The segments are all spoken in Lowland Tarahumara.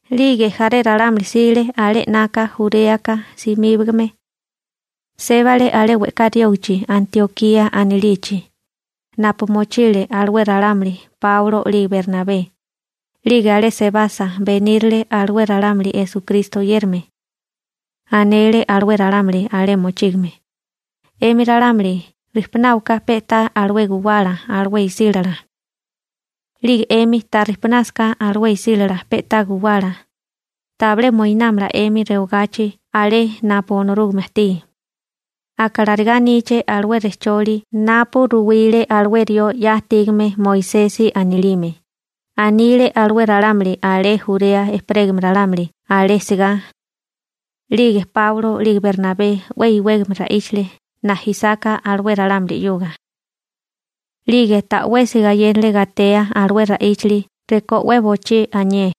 'Lige jaré ralámuli jsile alé 'naka Juréaka simíbagame. Sébale alé we'ká riógichi Antiokía anilichi, napu mochile alué ralámuli Páulo 'lige Bernabé. 'Lige alé sebasa, benírile alué ralámuli Esukristo oyérame. Anele alué ralámuli alé mochígame: ―'Emi ralámuli rijpunáwaká pe'tá alué guwala alué isílala. 'Lige 'emi ta rijpunásaká alué isílala pe'tá guwala, tabilé moinámala 'emi rewagachi alé napu Onorúgame ajtí. Aka larigá aníché alué rejcholi napu ruwile alué rió 'ya ajtígame Moisesi anilime ―anile alué ralámuli alé Jurea ejperégame ralámuli alé sigá. 'Lige Páulo 'lige Bernabé 'we iwégame ra'íchale najisáká alué ralámuli 'yuga. 'Lige ta'wesi gayénale gatea alué ra'íchali rekó 'we bochí anié.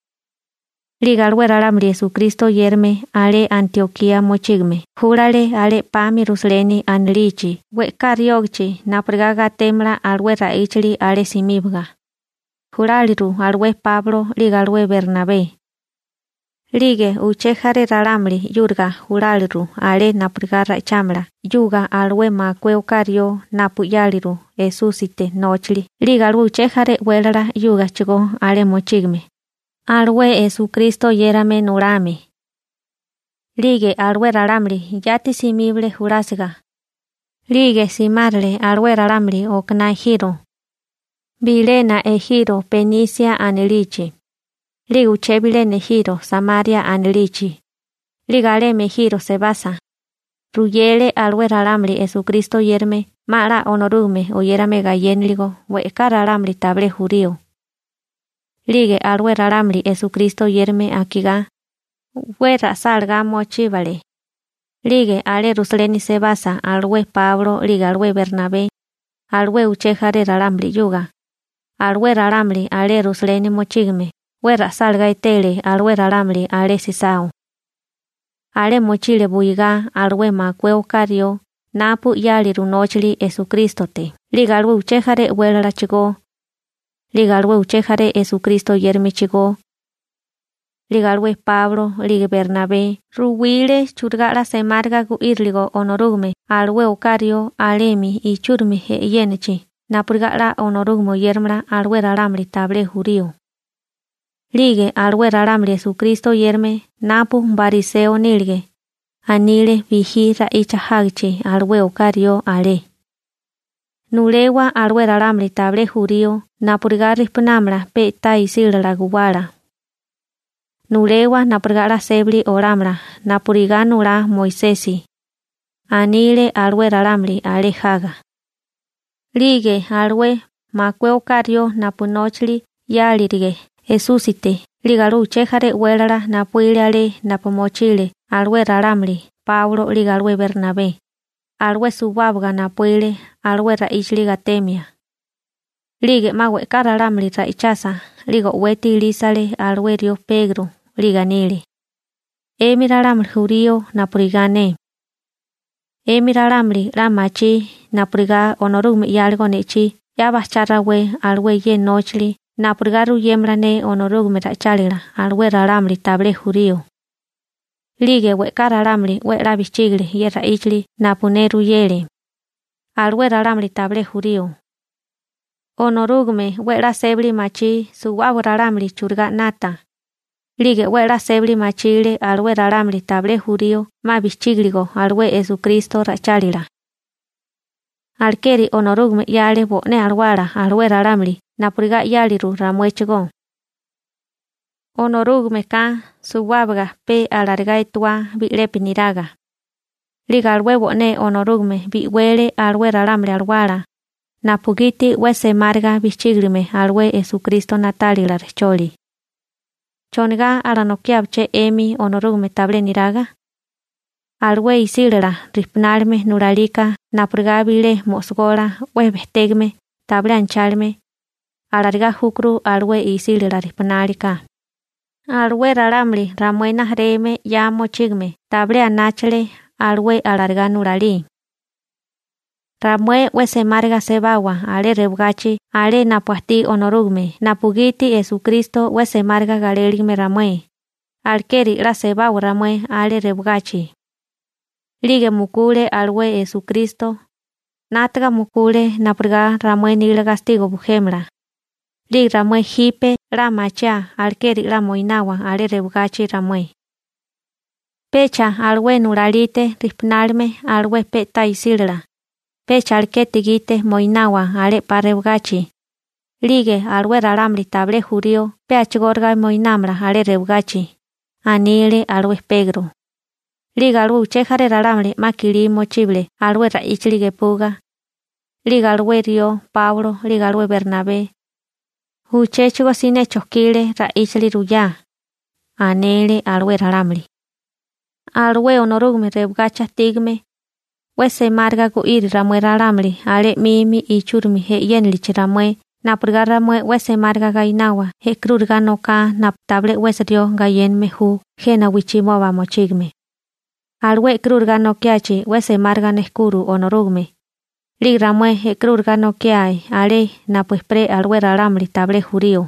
'Lige alué ralámuli Esukristo oyérame alé Antiokía mochígame júlale alé 'pami Rusaleni anilichi we'ká riógichi napurigá gatémala alué ra'íchili alé simíbaga. Juláliru alué Páulo 'lige alué Bernabé. 'Lige uché jaré ralámuli 'yúriga juláliru alé napurigá ra'ichámala 'yuga alué makué oká rió napu 'yáliru Esúsite nóchali 'lige alué uché jaré e'wélala 'yúgachigó alé mochígame, alué Esukristo oyérame nulame. 'Lige alué ralámuli yati simíbale julásiga, 'lige simárale alué ralámuli okaná ejiro. Bilena ejiro Benise anilichi, 'lige uché bilena ejiro Samaria anilichi. 'Lige alemi ejiro sebasa, ruyele alué ralámuli Esukristo oyérame 'ma 'la Onorúgame oyérame gayénaligo we'ká ralámuli tabilé jurío. 'Lige alué ralámuli Esukristo oyérame akigá, 'we ra'sálagá mochíbale. 'Lige alé Rusaleni sebasa alué Páulo 'lige alué Bernabé alué uché jaré ralámuli 'yuga, alué ralámuli alé Rusaleni mochígame 'we ra'sálagá etele alué ralámuli alé sisao. Alé mochile buigá alué makué oká rió napu 'yáliru nóchali Esukrístote 'lige alué uché jaré e'wélalachigó, 'lige alué uché jaré Esukristo oyéramechigó. 'Lige alué Páulo 'lige Bernabé ruwile churigá 'la semáriga gu'íriligo Onorúgame alué oká rió alemi ichúrimi e'yénachi napurigá 'la Onorúgame oyéramala alué ralámuli tabilé jurío. 'Lige alué ralámuli Esukristo oyérame napu bariseo nílige, anile bijí ra'icha jágichi alué oká rió alé: ―Nulewa alué ralámuli tabilé jurío napurigá rijpunámala pe'tá isílala guwálala, nulewa napurigá 'la sébali olámala napurigá nulá Moisesi ―anile alué ralámuli alé jaga. 'Lige alué makué oká rió napu nóchali 'yárilige Esúsite 'lige alué uché jaré e'wélala napuíle alé napu mochile alué ralámuli Páulo 'lige alué Bernabé, alué suwábaga napuíle alué ra'íchili gatemia. 'Lige 'ma we'ká ralámuli ra'ichasa 'lige o'weti ilísale alué rió Pegro, 'lige anile: ―'Emi ralámuli jurío napurigá ne, 'emi ralámuli 'la machí napurigá Onorúgame 'yáligo ne'chí 'ya bajchá rawé alué ye nóchili napurigá ruyémala ne Onorúgame ra'ichálila alué ralámuli tabilé jurío. 'Lige we'ká ralámuli 'we 'la bijchígile ye ra'íchili napu ne ruyele, alué ralámuli tabilé jurío. Onorúgame 'we a'lá sébali machí suwábaga ralámuli churigá 'nata. 'Lige 'we a'lá sébali machile alué ralámuli tabilé jurío 'ma bijchígiligo alué Esukristo ra'ichálila. Alekeri Onorúgame 'yale bo'né Alawala alué ralámuli napurigá 'yáliru ramuéchigó. Onorúgameka suwábaga pe alarigá etuá bi'lepi niraga. 'Lige alué bo'né Onorúgame bi'wele alué ralámuli alawala, napugiti 'we semáriga bijchígilime alué Esukristo na'tálila rejcholi. ¿Chonigá alanokiábaché 'emi Onorúgame tabilé niraga? Alué isílala rijpunálime nulalika napurigá bilé mo'sogola 'we bejtégame tabilé anachálime, alarigá júkuru alué isílala rijpunali ka. Alué ralámuli ramué rijimala 'ya mochígame tabilé anáchale alué alarigá nulalí. Ramué 'we semáriga sebawa alé rewagachi alé napu ajtí Onorúgame napugiti Esukristo 'we semáriga galéligime ramué, alekeri 'la sebawa ramué alé rewagachi. 'Lige mukule alué Esukristo, 'nátaga mukule napurigá ramué nila gastigo bujémala. 'Lige ramué jipe 'la machiáa alekeri 'la moinawa alé rewagachi ramué. Pecha alué nulalite rijpunálime alué pe'tá isila, pecha alekete gite moinawa alé 'pa rewagachi. 'Lige alué ralámuli tabilé jurío pe a'chigóriga moinámala alé rewagachi ―anile alué Pegro. 'Lige alué uché jaré ralámuli 'ma kilí mochíbale alué ra'íchili gepuga. 'Lige alué rió Páulo 'lige alué Bernabé, uchéchigo siné chojkile ra'íchili ruyá. Anele alué ralámuli: ―Alué Onorúgame rewagachi ajtígame, 'we semáriga gu'iri ramué ralámuli alé 'mimi ichúrimi e'yénilichi ramué napurigá ramué 'we semáriga gainawa e'karúriga noká napu tabilé 'wesi rió gayéname ju jena wijchimoba mochígame. Alué e'karúriga nokiachi 'we semáriga nejkuro Onorúgame. 'Lige ramué e'karúriga nokiae alé napu ejperé alué ralámuli tabilé jurío.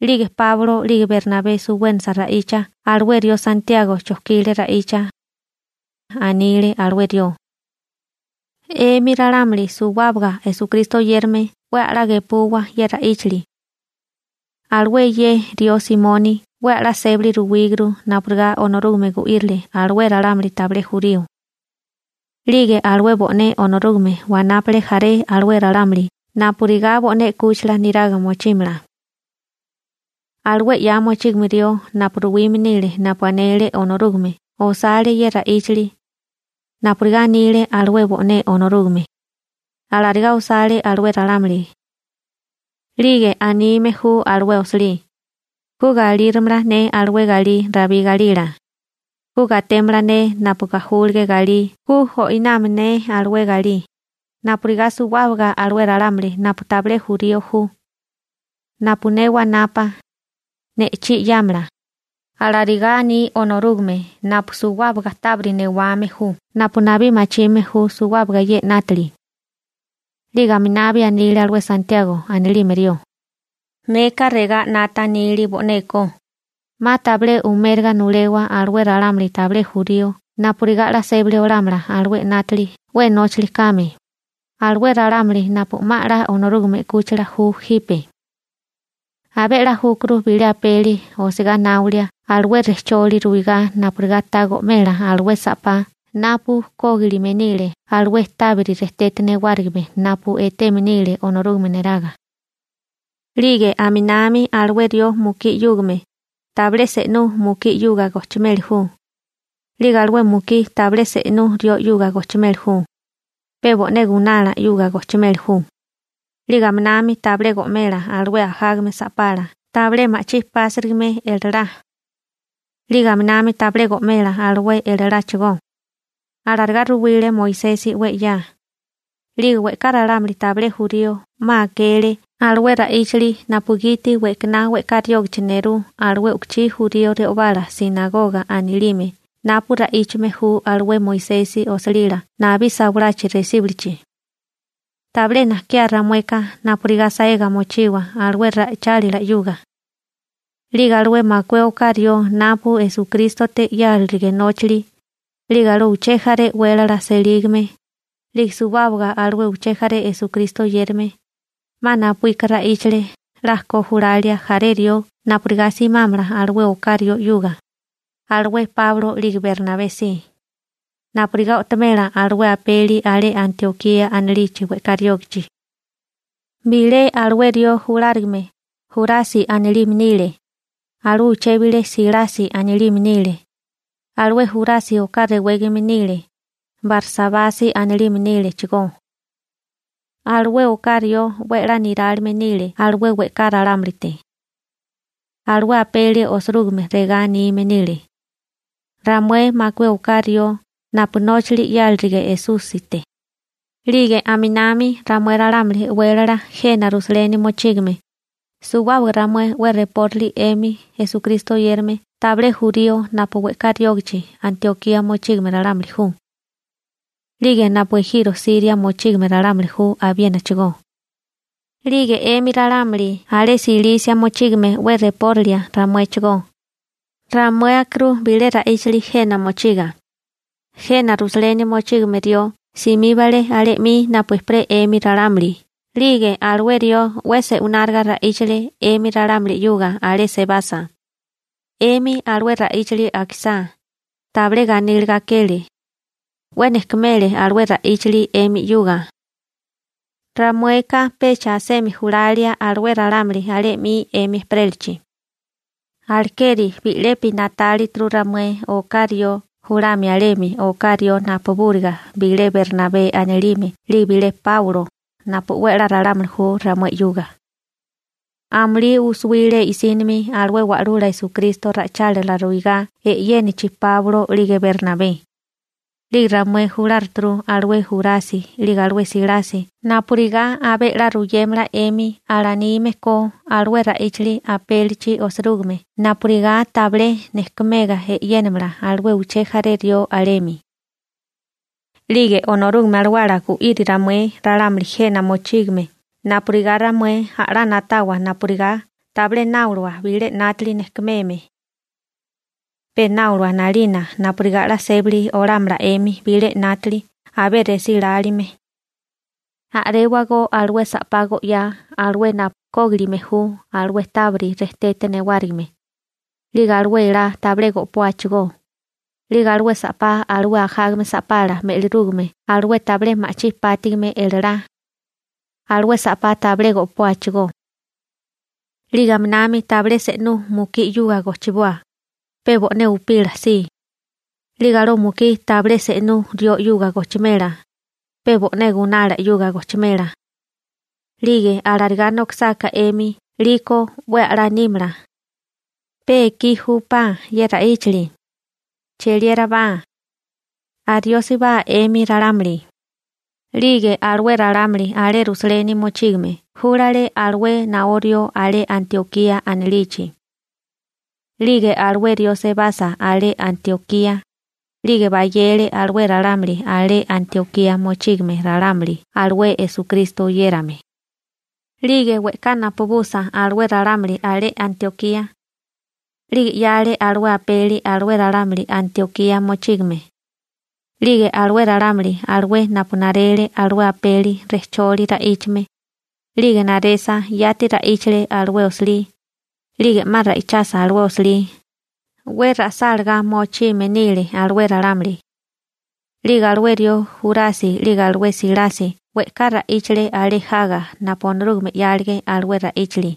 'Lige Páulo 'lige Bernabé suwénasa ra'icha alué rió Santiago (Akobo) chojkile ra'icha. Anile alué rió: ―'Emi ralámuli o'maka Esukristo oyérame 'we a'lá gepuwa ye ra'íchili. Alué ye rió Simoni (Pegro) 'we a'lá sébali ruwíguru napurigá Onorúgame gu'írile alué ralámuli tabilé jurío. 'Lige alué bo'né Onorúgame wanápale jaré alué ralámuli napurigá bo'né 'kúchila niraga mochímala. Alué 'ya mochígame rió napu ruwime nile napu anele Onorúgame osale ye ra'íchili. Napurigá anile alué bo'né Onorúgame, alarigá osale alué ralámuli. 'Lige anime ju alué osilí: Ku galirámala ne alué galí Rabí galila, ku gatémala ne napu gajúlige galí ku o'inámala ne alué galí, napurigá suwábaga alué ralámuli napu tabilé jurío ju, napu ne wanapa, ne'chí 'yámala. Alarigá aní Onorúgame napu suwábaga tábiri newame ju napu nabí machime ju suwábaga ye 'nátili. 'Lige aminabi anile alué Santiago anilime rió: ―Neka regá 'nata nili bo'neko, 'ma tabilé umériga nulewa alué ralámuli tabilé jurío napurigá 'la sébali olámala alué 'nátili 'we nóchali kame, alué ralámuli napu 'ma 'la Onorúgame 'kúchila ju jipe. Abé 'la júkuru bilé apeli osigá náolia alué rejcholi ruwigá napurigá ta go'mela alué sa'pá napu kógilime nile alué tábiri rejtete newárigime napu eteme nile Onorúgame neraga. 'Lige aminami alué rió mukí 'yúgame, tabilé se'nú mukí 'yuga gojchimeli ju. 'Lige alué mukí tabilé se'nú rió 'yuga gojchimeli ju, pe bo'né gunala 'yuga gojchimeli ju. 'Lige aminami tabilé go'mela alué ajágame sa'pala tabilé ma'chí pásirigime elalá. 'Lige aminami tabilé go'mela alué elaláchigó. Alarigá ruwile Moisesi 'we 'ya, 'lige we'ká ralámuli tabilé jurío 'ma akele alué ra'íchali napugiti we'kaná we'ká riógichi nerú alué u'kuchí jurío re'obala «sinagoga» anilime napu ra'íchame ju alué Moisesi osilila nabí sawalachi resíbulichi. Tabilé najkiá ramueka napurigá saega mochiwa alué ra'ichálila 'yuga. 'Lige alué makué oká rió napu Esukrístote 'yárilige nóchali, 'lige alué uché jaré e'wélala selígame, 'lige suwábaga alué uché jaré Esukristo oyérame, 'ma napuíka ra'íchale 'la ko julalia jaré rió napurigá simámala alué oká rió 'yuga, alué Páulo 'lige Bernabé si, napurigá o'tomela alué apeli alé Antiokía anilichi we'ká riógichi. Bilé alué rió julárigame Jurasi anilime nile. Alué uché bilé Silasi anilime nile. Alué Jurasi oká rewégame nile, Barsabasi anilime nílechigó. Alué oká rió 'we 'la nirálime nile alué we'ká ralámulite. Alué apeli osirúgime regá anime nile: «Ramué makué oká rió napu nóchili 'yárilige Esúsite, 'lige aminami ramué ralámuli e'wélala jena Rusaleni mochígame, suwábaga ramué 'we repóralia 'emi Esukristo oyérame tabilé jurío napu we'ká riógichi Antiokía mochígame ralámuli ju, 'lige napu ejiro Siria mochígame ralámuli ju abiénachigó, 'lige 'emi ralámuli alé Silisia mochígame 'we repórilia ramuéchigó. Ramué akirú bilé ra'íchili jena mochiga. Jena Rusaleni mochígame rió simíbale alé 'mi napu ejperé 'emi ralámuli 'lige alué rió 'we se'wináriga ra'íchale 'emi ralámuli 'yuga alé sebasa. 'Emi alué ra'íchali akisá, tabilé ganíliga akele, 'we nejkumele alué ra'íchali 'emi 'yuga. Ramueka pecha asemi julalia alué ralámuli alé 'mi 'emi ejperélachi. Alekeri bi'lepi na'tálituru ramué oká rió julamia alemi oká rió napubúriga bilé Bernabé anilime 'lige bilé Páulo napu 'we a'lá ralámuli ju ramué 'yuga. Amulí u'suwile i'sínimi alué Wa'lula Esukristo ra'ichálila ruigá e'yénachi Páulo 'lige Bernabé. 'Lige ramué juláruturu alué Jurasi 'lige alué Silasi napurigá abé 'la ruyémala 'emi 'la anime ko alué ra'íchali apélichi osirúgime napurigá tabilé nejkumega e'yénamala alué uché jaré rió alemi. 'Lige Onorúgame Alawala gu'iri ramué ralámuli jena mochígame napurigá ramué a'lá na'tawa napurigá tabilé náolawa bilé 'nátili nejkumeme. Pe náolawa 'nalina napurigá 'la sébali olámala 'emi bilé 'nátili abé resí lálime. A'réwagó alué sa'pá go'yá alué napu kógilime ju alué tábiri rejtete newárigime. 'Lige alué elá tabilé go'póachigó. 'Lige alué sa'pá alué ajágame sa'pala me'lirúgame alué tabilé ma'chí pátigime elalá, alué sa'pá tabilé go'póachigó. 'Lige aminami tabilé se'nú mukí 'yuga gochiboa, pe bo'né upila si. 'Lige alué mukí tabilé se'nú rió 'yuga gochimela, pe bo'né gunala 'yuga gochimela. 'Lige alarigá nokisáká 'emi 'liko 'we a'lá nímala. Pe ekí júpá ye ra'íchili, cheliérabá, ariósibá 'emi ralámuli.» 'Lige alué ralámuli alé Rusaleni mochígame júlale alué naó rió alé Antiokía anilichi. 'Lige alué rió sebasa alé Antiokía, 'lige bayele alué ralámuli alé Antiokía mochígame ralámuli alué Esukristo oyérame. 'Lige we'ká napubusa alué ralámuli alé Antiokía, 'lige 'yale alué apeli alué ralámuli Antiokía mochígame. 'Lige alué ralámuli alué napu narele alué apeli rejcholi ra'íchame, 'lige naresa yati ra'íchale alué osilí. 'Lige 'ma ra'íchasa alué osilí, 'we ra'sálagá mochime nile alué ralámuli. 'Lige alué rió Jurasi 'lige alué Silasi we'ká ra'íchale alé jaga napu Onorúgame 'yálige alué ra'íchali.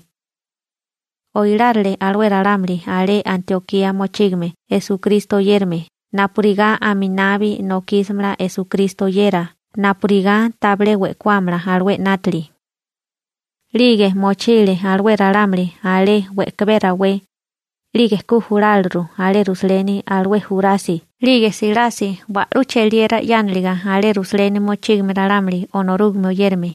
Oilárile alué ralámuli alé Antiokía mochígame Esukristo oyérame napurigá aminabi nokísimala Esukristo oyera napurigá tabilé we'kuámala alué 'nátili. 'Lige mochile alué ralámuli alé we'kabé rawé. 'Lige ku juláliru alé Rusaleni alué Jurasi 'lige Silasi wa'lú cheliera 'yániliga alé Rusaleni mochígame ralámuli Onorúgame oyérame.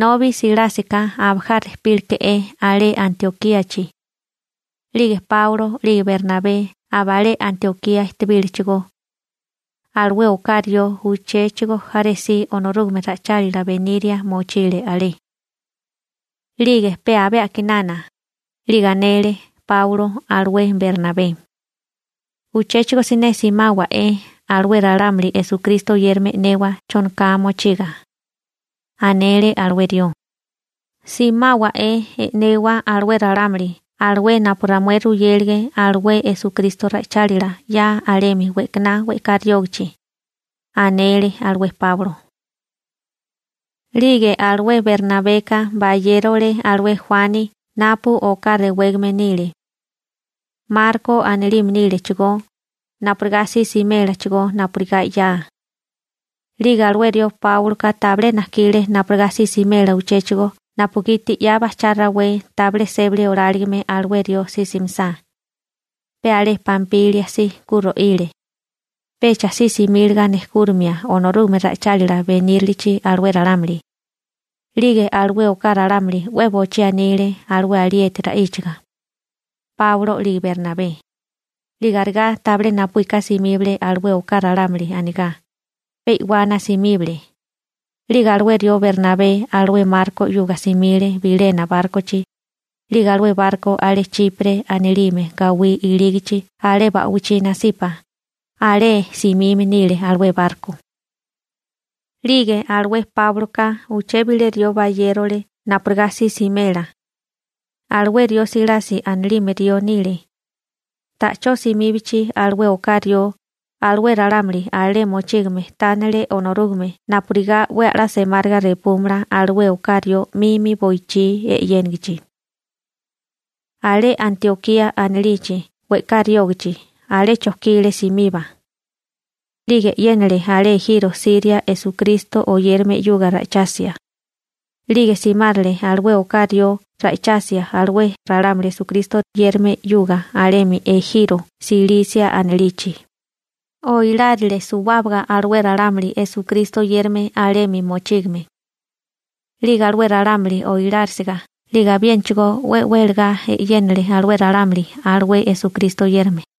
Nobi Silásika abajá rejpínaleke'é alé Antiokíachi. 'Lige Páulo 'lige Bernabé abalé Antiokía ejtebílechigó. Alué oká rió uchéchigo jaré si Onorúgame ra'ichálila beniria mochile alé. 'Lige pe abé a'kinana, 'lige anele Páulo alué Bernabé: ―Uchéchigo siné simáwa'é alué ralámuli Esukristo oyérame e'newa chonoká mochiga ―anele alué rió―. Simáwa'é e'newa alué ralámuli alué napu ramué ruyélige alué Esukristo ra'ichálila 'ya alemi we'kaná we'ká riógichi ―anele alué Páulo. 'Lige alué Bernabeka bayérole alué Juani napu oká rewégame nile, Marko anilime nílechigó, napurigá si simélachigó napurigá 'ya. 'Lige alué rió Páuloka tabilé najkile napurigá si simela uchéchigo napugiti 'ya bajchá rawé tabilé sébali oláligime alué rió si simisá. Pe alé Pampilia si ku ro'ile. Pecha si simíliga nejkúrimia Onorúgame ra'ichálila benírilichi alué ralámuli. 'Lige alué oká ralámuli 'we bochí anile alué alieti ra'íchaga, Páulo 'lige Bernabé. 'Lige arigá tabilé napuíka simíbale alué oká ralámuli anigá. Pe i'wana simíbale. 'Lige alué rió Bernabé alué Marko 'yuga simile bilena bárkochi. 'Lige alué barko alé Chipre anilime gawí ilígachi alé ba'wichí nasipa, alé simime nile alué barko. 'Lige alué Páuloka uché bilé rió bayérole napurigá si simela. Alué Silasi anilime rió nile. Ta'chó simíbachi alué oká rió, alué ralámuli alé mochígame tánele Onorúgame napurigá 'we a'lá semáriga repúmala alué oká rió 'mimi boichí e'yénigichi. Alé Antiokía anilichi we'ká riógichi alé chojkile simiba, 'lige e'yénale alé ejiro Siria Esukristo oyérame 'yuga ra'ichasia. 'Lige simárale alué oká rió ra'ichasia alué ralámuli Esukristo oyérame 'yuga alemi ejiro Silisia anilichi. Oilárile suwábaga alué ralámuli Esukristo oyérame alemi mochígame. 'Lige alué ralámuli oilárisiga 'lige abiénachigó 'we welagá e'yénale alué ralámuli alué Esukristo oyérame.